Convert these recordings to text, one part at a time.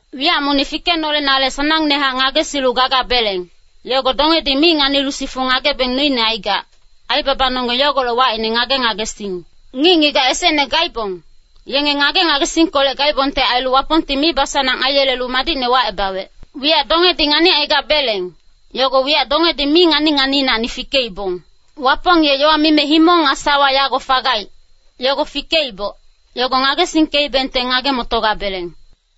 Wiyac monic fikenolenale sanangnehac ngagesilu gagabeleng, yogo dongedi mi nganilu sifu ngagebeng noine aigac, aibabanonggeng yogolec wacine ngage-ngagesing. Ngic-ngigac esecne gaibong, yenge ngage-ngagesingkolec gaibongte ailu Wapongti mibasanang aiyelelu madicne wacebawec. Wiyac dongedi nganicaigabeleng, yogo wiyac dongedi mi ngani-nganiinacni fikeibong. Wapong ye yowa mime himong nga sawa yago fagaic, yogo fikeiboc, yogo ngagesingkeibengte ngage-motogabeleng.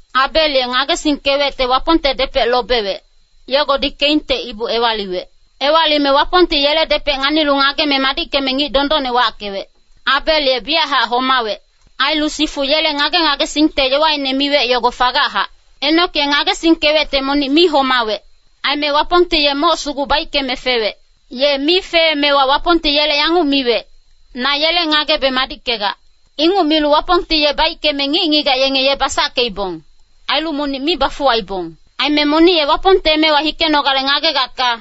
Abel ye ngagesingkewecte Wapongte depec lobewec, yogodi Keinte ibu ewaliwec. Ewalime Wapongti yele depec nganilu ngageme madickeme ngic dondonne wackewec. Abel ye biyachac homawec. Ailu sifu yele ngage-ngagesingte yowaine miwec yogo fagachac. Enok ye ngagesingkewecte monic mi homawec. Aime Wapongti ye moc sugu baickeme fewec. Ye mi feemewa Wapongti yele yanguc miwec, “Na yele ngagebe madickegac.” Inguc milu Wapongti ye baickeme ngic-ngigac yenge ye basackeibong, ailu monic mi bafuwaibong. Aime monic ye Wapongte emewa hikenogale ngagegacka,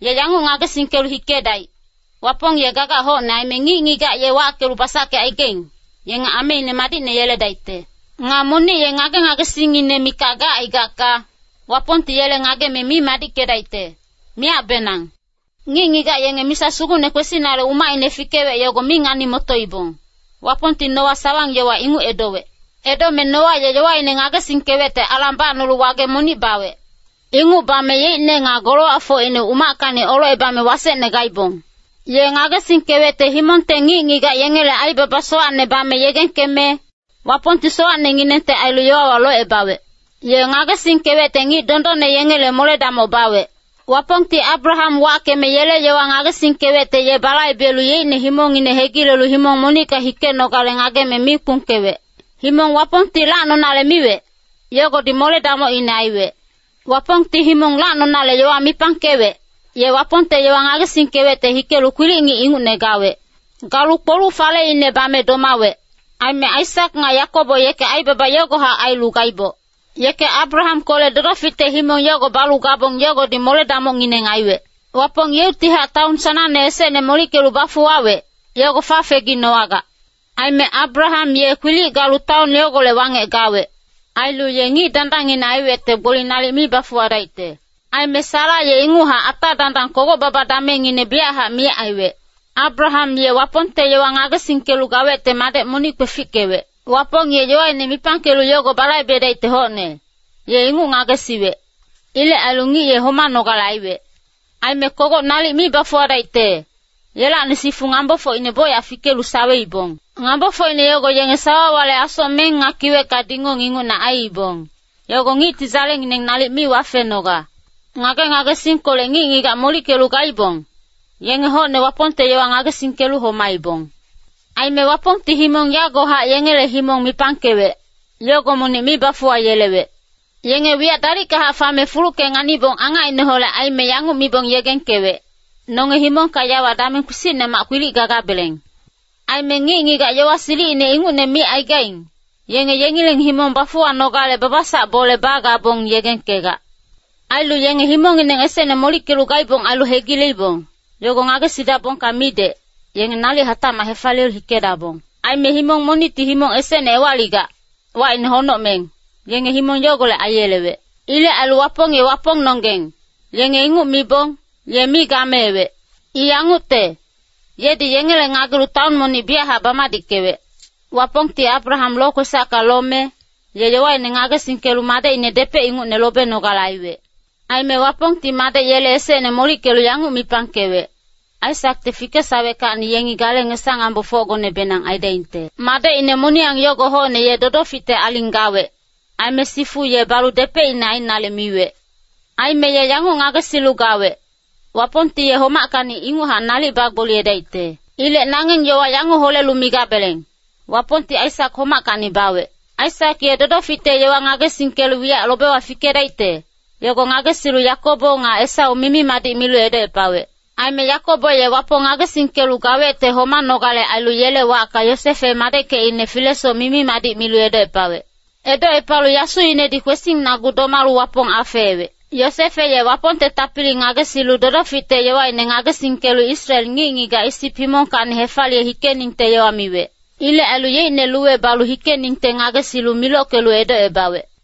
ye yanguc ngagesingkelu hikedaic, Wapong ye gagac hocne aime ngic-ngigac ye wackelu basackecaigaing, yenge ameine madicne yeledaicte. Nga monic ye ngage-ngagesingngine mikac gacaigacka, Wapongti yele ngageme mi madickedaicte, miyacbenang. Ngic-ngigac yenge misa sugucne kwesinale umacine fikewec yogo mi ngani-motoibong, Wapongti Noa sawang-yowa inguc edowec. Edome Noa ye yowaine ngagesingkewecte alang bacnolu wage monic bawec. Inguc bame yeicne nga golowacfocine umackacni olocebame wasecne gaibong. Ye ngagesingkewecte himongte ngic-ngigac yengele aibaba sowacne bame yegengkeme, Wapongti sowacnenginengte ailu yowawa locebawec. Ye ngagesingkewecte ngic dondonne yengele mole-damoc bawec. Wapongti Abraham wackeme yele yowa ngagesingkewecte ye balaibelu yeicne himongngine hegilelu himong monicka hikenogale ngageme mi kpungkewec. Himong Wapongti lacnonale miwec, yogodi mole-damocine aiwec. Wapongti himong lacnonale yowa mipangkewec, ye Wapongte yowa ngagesingkewecte hikelu kwilic-ngic ingucne gawec. Galu kpoluc-faleine bame domawec. Aime Aisak nga Yakobo yeke aibaba yogohac ailu gaiboc. Yeke Abrahamkolec dodoficte himong yogo balu gabong yogodi mole-damocngineng aiwec. Wapong yeuctihac taon sanangne esecne molickelu bafuwawec, yogo fafeginowagac. Aime Abraham ye kwilic galu taon yogolec wangec gawec. Ailu ye ngic dandangngine aiwecte gboli nalic mi bafuwadaicte. Aime Sara ye inguchac ata dandang kogoc-baba damengngine biyachac miyac aiwec. Abraham ye Wapongte yowa ngagesingkelu gawecte madec monic kwefickewec. Wapong ye yowaine mipangkelu yogo balaibedaicte hocne, ye inguc ngagesiwec. Ilec ailu ngic ye homanogale aiwec. Aime kogoc nalic mi bafuwadaicte, yelacni sifu ngambofocine bocyac fikelu saweibong. Ngambofocine yogo yenge sawawale asocmeng nga kiwecka dingong ingucne aiibong, yogo ngicti dzalengineng nalic mi wafenoga. Ngage-ngagesingkolec ngic-ngigac molickelu gaibong, yenge hocne Wapongte yowa ngagesingkelu homaibong. Aime Wapongti himong yagohac yengele himong mipangkewec, yogo monic mi bafuwayelewec. Yenge wiyac dalickahac fame fulucke nganibong angacineholec aime yanguc mibong yegengkewec, “Nonge himongka yawa dameng kpisicnemac kwilic gagabeleng.” Aime ngic-ngigac yowa silicine ingucne micaigaing, yenge yengileng himong bafuwanogale babasac bole bagabong yegengkegac. Ailu yenge himongngineng esecne molickelu gaibong ailu hegileibong, yogo ngagesidabongka midec, yenge nalic hatacmac hefaliyelu hikedabong. Aime himong monicti himong esecne ewaligac, wacine honocmeng, yenge himong yogolec aiyelewec. Ilec ailu “Wapong ye Wapongnonggeng,” yenge inguc mibong, ye mi gameewec. I yangucte, yedi yengele ngagelu taon monic biyachac bamadickewec. Wapongti Abraham lokwesacka lome, ye yowaine ngagesingkelu madecine depec ingucne lobenogale aiwec. Aime Wapongti madec yele esecne molickelu yanguc mipangkewec, “Aisakte fikesaweckacni yengi gale ngesa-ngambofocgonebenang aidaingte.” Madecine moniyang yogo hocne ye dodoficte aling gawec, aime sifu ye balu depecine ainale miwec. Aime ye yanguc ngagesilu gawec, “Wapongti ye homackacni inguchac nalic bagboliyedaicte.” Ilec nangeng yowa yanguc holelu migabeleng, “Wapongti Aisak homackacni bawec.” Aisak ye dodoficte yowa ngagesingkelu wiyac lobewa fikedaicte, yogo ngagesilu Yakobo nga Esau mimi-madic milu edocepawec. Aime Yakobo ye Wapong ngagesingkelu gawecte homanogale ailu yele wacka Yosefe madeckecine filesoc mimi-madic milu edocepawec. Edocepalu yasuinedi kwesingnagu domalu Wapong afeewec. Yosefe ye Wapongte tapili ngagesilu dodoficte yowaine ngagesingkelu Israel ngic-ngigac Isip himongkacni hefaliye hikeningte yowa miwec. Ilec ailu yeicne luwe balu hikeningte ngagesilu milockelu edocebawec.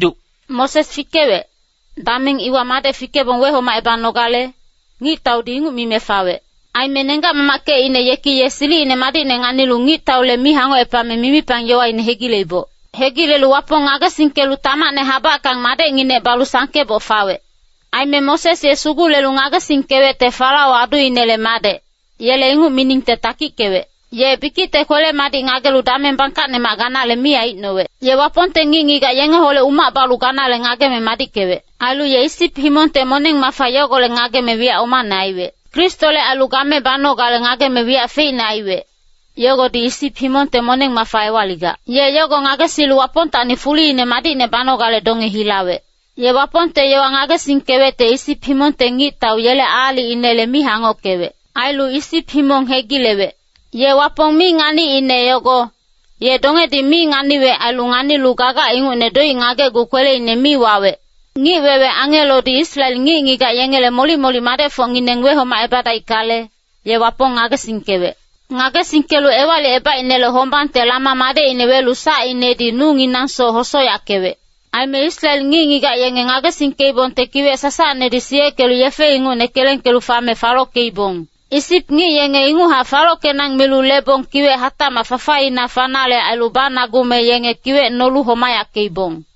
Moses fikewec, dameng iwa madec fikebong wehomacebanogale, ngictaudi inguc mime fawec. Aime nenggac-mamackecine yeki ye silicine madicne nganilu ngictaule mi hangocepame mimipang yowaine hegileiboc. Hegilelu Wapong ngagesingkelu tamacne habackang madecnginec balu sangkeboc fawec. Aime Moses ye sugulelu ngagesingkewecte Farao aduinele madec, yele inguc miningte takickewec. Ye bikicte kwele-madic ngagelu dameng bangkacnemac ganale mi aicnowec. Ye Wapongte ngic-ngigac yengeholec umac balu ganale ngageme madickewec. Ailu ye Isip himongte moneng-mafa yogolec ngageme wiyac omane aiwec. Kristole ailu game banogale ngageme wiyac feicne aiwec, yogodi Isip himongte moneng-mafa ewaligac. Ye yogo ngagesilu Wapongtacni fuliine madicne banogale donge hilawec. Ye Wapongte yowa ngagesingkewecte Isip himongte ngictau yele aalicinele mi hangockewec. Ailu Isip himong hegilewec. Ye Wapong mi nganiicne yogo, ye dongedi mi nganiwec ailu nganilu gagac ingucne doic ngagecgu kweleine mi wawec. Ngic-wewe angelodi Israel ngic-ngigac yengele molic-molic madecfocngineng wehomacebadaickale, ye Wapong ngagesingkewec. Ngagesingkelu Ewalicebaicnele Hombangte lama madecine welu sacinedi nunginangsoc hosoyackewec. Aime Israel ngic-ngigac yenge ngagesingkeibongte Kiwec Sasacnedi siyeckelu yefe ingucne kelengkelu fame falockeibong. Isip ngic yenge inguchac falockenang milu lebong kiwec hatacmac fafaina fanale ailu banagume yenge kiwec nolu homayackeibong.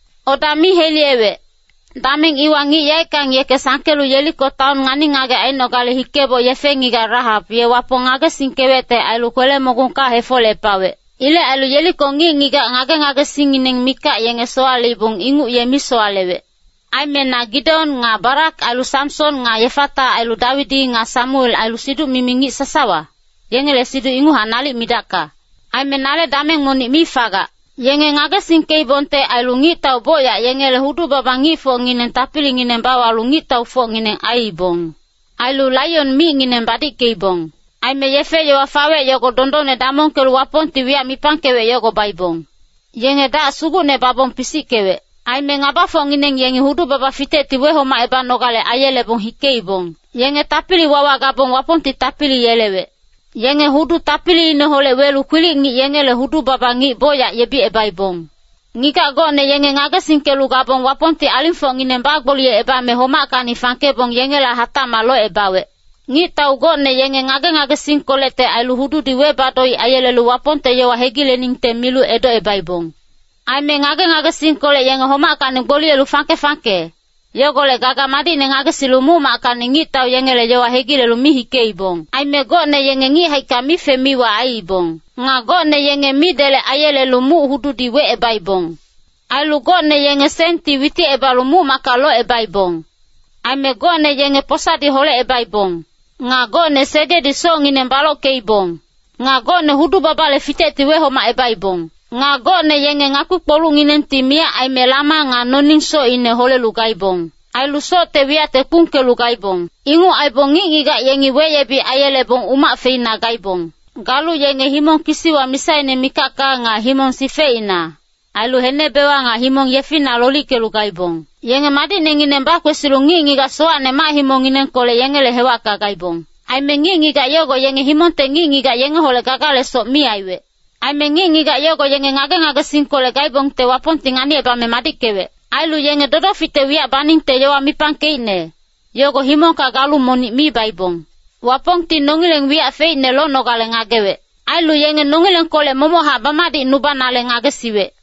Oda mi heliyewec, dameng iwa ngic yaeckang yeke sangkelu Yeriko taon ngani-ngagec ainogale hikeboc yefe-ngigac Rahap ye Wapong ngagesingkewecte ailu kwele-mogungka hefolecepawec. Ilec ailu Yeriko ngic-ngigac ngage-ngagesingngineng mikac yenge sowaleibong inguc ye mi sowalewec. Aime na Gideon nga Barak ailu Samson nga Yefata ailu Dawidi nga Samuel ailu siduc-mimi ngic sasawa, yengele siduc inguchac nalic midacka. Aime nale dameng monic mi fagac. Yenge ngagesingkeibongte ailu ngictau bocyac yengele hudu-baba ngicfocngineng tapilingineng bawalu ngictaufocngineng aiibong. Ailu laion micngineng badickeibong. Aime yefe-yowa fawec yogo dondonne damongkelu Wapongti wiyac mipangkewec yogo baibong. Yenge dac sugucne babong pisickewec. Aime ngabafocngineng yengi hudu-baba fitecti wehomacebanogale aiyelebong hikeibong. Yenge tapili-wawa gabong Wapongti tapili yelewec. Yenge hudu tapiliineholec welu kwilic-ngic yengele hudu-baba ngic bocyac yebicebaibong. Ngigac gocne yenge ngagesingkelu gabong Wapongti alingfocngineng bagboliyecebame homackacni fangkebong yengela hatacmac locebawec. Ngictau gocne yenge ngage-ngagesingkolecte ailu hududi weba-doic aiyelelu Wapongte yowa hegileningte milu edocebaibong. Aime ngage-ngagesingkolec yenge homackacni gboliyelu fangke-fangke, yogolec gaga madicne ngagesilu muc-mackacni ngictau yengele yowa hegilelu mi hikeibong. Aime gocne yenge ngic haicka mife-miwa aiibong. Nga gocne yenge midelec aiyelelu muc-hududi wecebaibong. Ailu gocne yenge senti witicebalu muc-macka locebaibong. Aime gocne yenge posadi holecebaibong. Nga gocne segedi socngineng balockeibong. Nga gocne hudu-babale fitecti wehomacebaibong. Nga gocne yenge ngakpi-kpolucnginengti miyac aime lama nga noning socine holelu gaibong. Ailu socte wiyacte kpungkelu gaibong. Inguc aibong ngic-ngigac yengi weyebic aiyelebong umac feina gaibong. Galu yenge himong kisiwa misaine mikacka nga himong sifecina, ailu henebewa nga himong yefina lolickelu gaibong. Yenge madicnengineng bakwesilu ngic-ngigac sowacne mac-himongnginengkolec yengele hewacka gaibong. Aime ngic-ngigac yogo yenge himongte ngic-ngigac yengeholec gagalesoc mi aiwec. Aime ngic-ngigac yogo yenge ngage-ngagesingkolec gaibongte Wapongti nganicebame madickewec. Ailu yenge dodoficte wiyac baningte yowa mipangkeicne, yogo himongka galu monic mi baibong. Wapongti nongileng wiyac feicne lonogale ngagewec. Ailu yenge nongilengkolec momochac bamadicnubanale ngagesiwec.